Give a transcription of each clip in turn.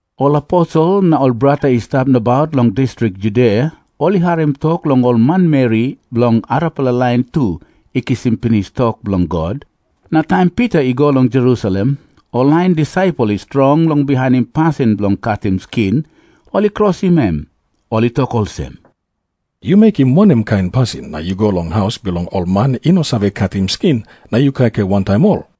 Ol aposel na ol brata i stap nabaut long distrik Judia ol i harim tok long ol manmeri bilong arapela lain tu i kisim pinis tok bilong God. Na taim Pita i go long Jerusalem, ol lain disaipel i strong long bihainim pasin bilong katim skin, ol i krosim em. Ol i tok olsem, "Yu mekim wanem kain pasin na yu go long haus bilong ol man i no save katim skin, na yu kaikai wantaim ol?"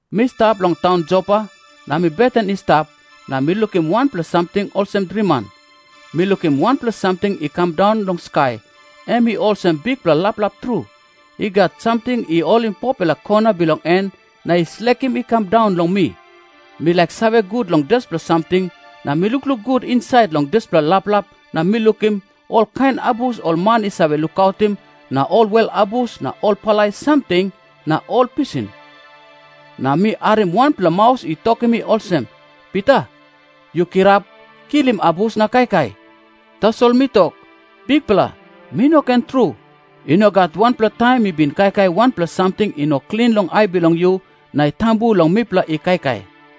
"Mi stap long taun Jopa, na mi beten i stap, na mi lukim wanpela samting olsem driman. Mi lukim wanpela samting i kam daun long skai, em i olsem bikpela laplap tru. I gat samting i holim 4-pela kona bilong en na i slekim i kam daun long mi. Mi laik save gut long dispela samting, na mi lukluk gut insait long dispela laplap na mi lukim olkain abus ol man i save lukautim na ol wel abus na ol palai samting na ol pisin. Na mi harim wanpela maus i tokim mi olsem, 'Pita, yu kirap kilim abus na kaikai.' Tasol mi tok, 'Bikpela, mi no ken tru! I no gat wanpela taim mi bin kaikai wanpela samting i no klin long ai bilong yu na i tambu long mipela i kaikai.'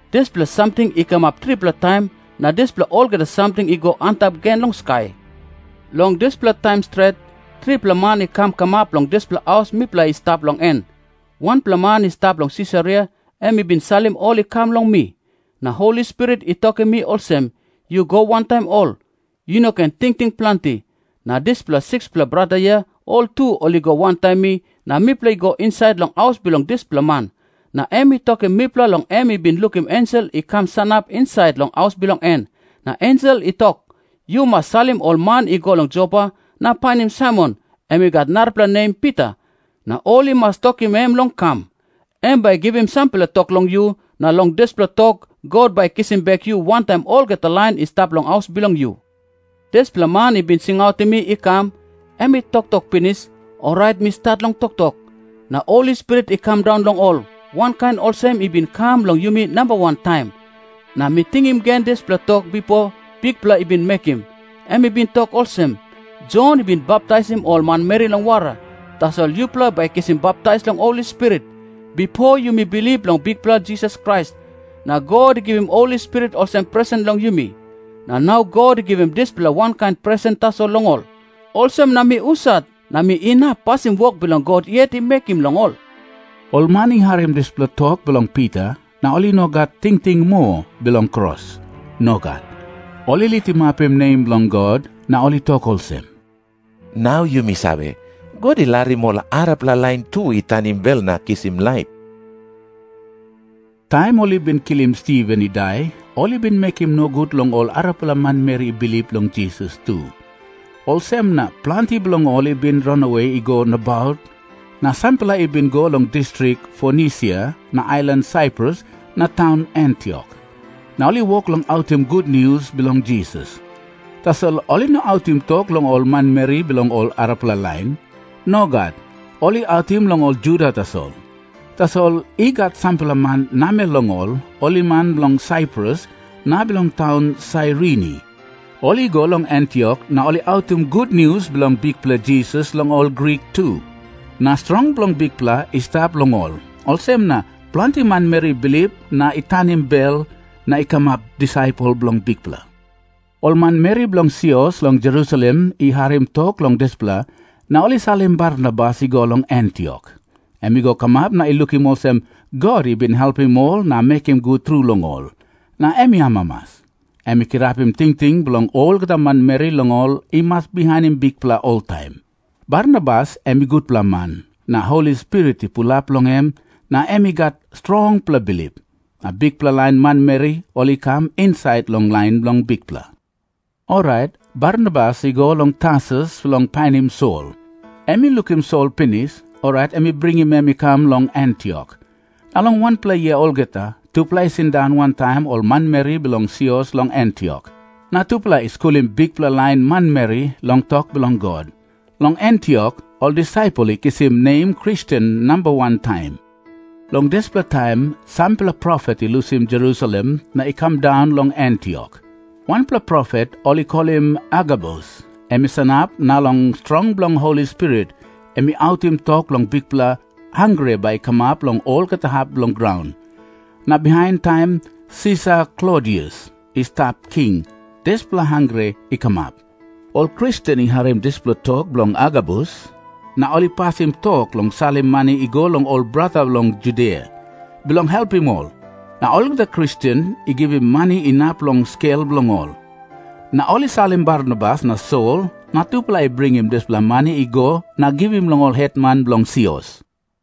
Dispela samting i kamap tripela taim, na dispela olgeta samting i go antap gen long skai. "Long dispela taim stret, tripela man i kam kamap long dispela haus mipela i stap long en. Wanpela man i stap long Sisaria em i bin salim ol i kam long mi. Na Holi Spirit i tokim mi olsem, 'Yu go wantaim ol. Yu no ken tingting planti.' Na dispela 6-pela brata hia ol tu ol i go wantaim mi, na mipela i go insait long haus bilong dispela man. Na em i tokim mipela long em i bin lukim ensel i kam sanap insait long haus bilong en, na ensel i tok, 'Yu mas salim ol man i go long Jopa na painim Saimon, em i gat narapela nem Pita. Na ol i mas tokim em long kam. Em bai i givim sampela tok long yu, na long dispela tok God bai i kisim bek yu wantaim olgeta lain i stap long haus bilong yu.' Dispela man i bin singautim mi i kam, em i toktok pinis, orait mi stat long toktok, na Holi Spirit i kam daun long ol, wankain olsem em i bin kam long yumi namba wan taim. Na mi tingim gen dispela tok bipo Bikpela i bin mekim. Em i bin tok olsem, 'Jon i bin baptaisim ol manmeri long wara, tasol yupela bai i kisim baptais long Holi Spirit.' Bipo yumi bilip long Bikpela Jisas Krais, na God i givim Holi Spirit olsem presen long yumi. Na nau God i givim dispela wankain presen tasol long ol. Olsem na mi husat na mi inap pasim wok God yet i mekim long ol?" Ol man i harim dispela tok bilong Pita, na ol i no gat tingting moa bilong kros. Nogat. Ol i litimapim nem bilong God na ol i tok olsem, "Nau yumi save, God i larim ol arapela lain tu i tanim bel na kisim laip." Taim ol i bin kilim Stiven i dai ol i bin mekim nogut long ol arapela manmeri i bilip long Jisas tu. Olsem na planti bilong ol i bin ranawe i go nabaut, na sampela i bin i go long distrik Fonisia na ailan Saiprus na taun Antiok, na ol i wok long autim gutnius bilong Jisas. Tasol ol i no autim tok long ol manmeri bilong ol arapela lain. Nogat. Ol i autim long ol Juda tasol. Tasol i gat sampela man namel long ol, ol i man bilong Saiprus na bilong taun Sairini, ol i go long Antiok na ol i autim gutnius bilong Bikpela Jisas long ol Grik tu. Na strong bilong Bikpela i stap long ol, olsem na planti manmeri i bilip na i tanim bel na i kamap disaipel bilong Bikpela. Ol manmeri bilong sios long Jerusalem i harim tok long dispela, na ol i salim Barnabas i go long Antiok. Em i go kamap na i lukim olsem God i bin helpim ol na mekim gut tru long ol, na em i amamas. Em i kirapim tingting bilong olgeta manmeri, long ol i mas bihainim Bikpela oltaim. Barnabas em i gutpela man, na Holi Spirit i pulap long em, na em i gat strongpela bilip. Na bikpela lain manmeri ol i kam insait long lain bilong Bikpela. Orait Barnabas i go long Tarsus bilong painim Sol. Em i lukim Sol pinis, orait em i bringim em i kam long Antiok. Na long wanpela yia olgeta, tupela i sindaun wantaim ol manmeri bilong sios long Antiok, na tupela i skulim bikpela lain manmeri long tok bilong God. Long Antiok ol disaipel i kisim nem Kristen namba wan taim. Long dispela taim sampela profet i lusim Jerusalem na i kam daun long Antiok. Wanpela profet ol i kolim Agabus, em i sanap na long strong bilong Holi Spirit em i autim tok long bikpela hangre bai i kamap long olgeta hap bilong graun. Na bihain, taim Sisar Klodius i stap king, dispela hangre i kamap. Ol Kristen i harim dispela tok bilong Agabus, na ol i pasim tok long salim mani i go long ol brata long Judia, bilong helpim ol. Na olgeta Kristen i givim mani inap long skel bilong ol. Na ol i salim Barnabas na Sol na tupela i bringim dispela mani i go na givim long ol hetman bilong sios.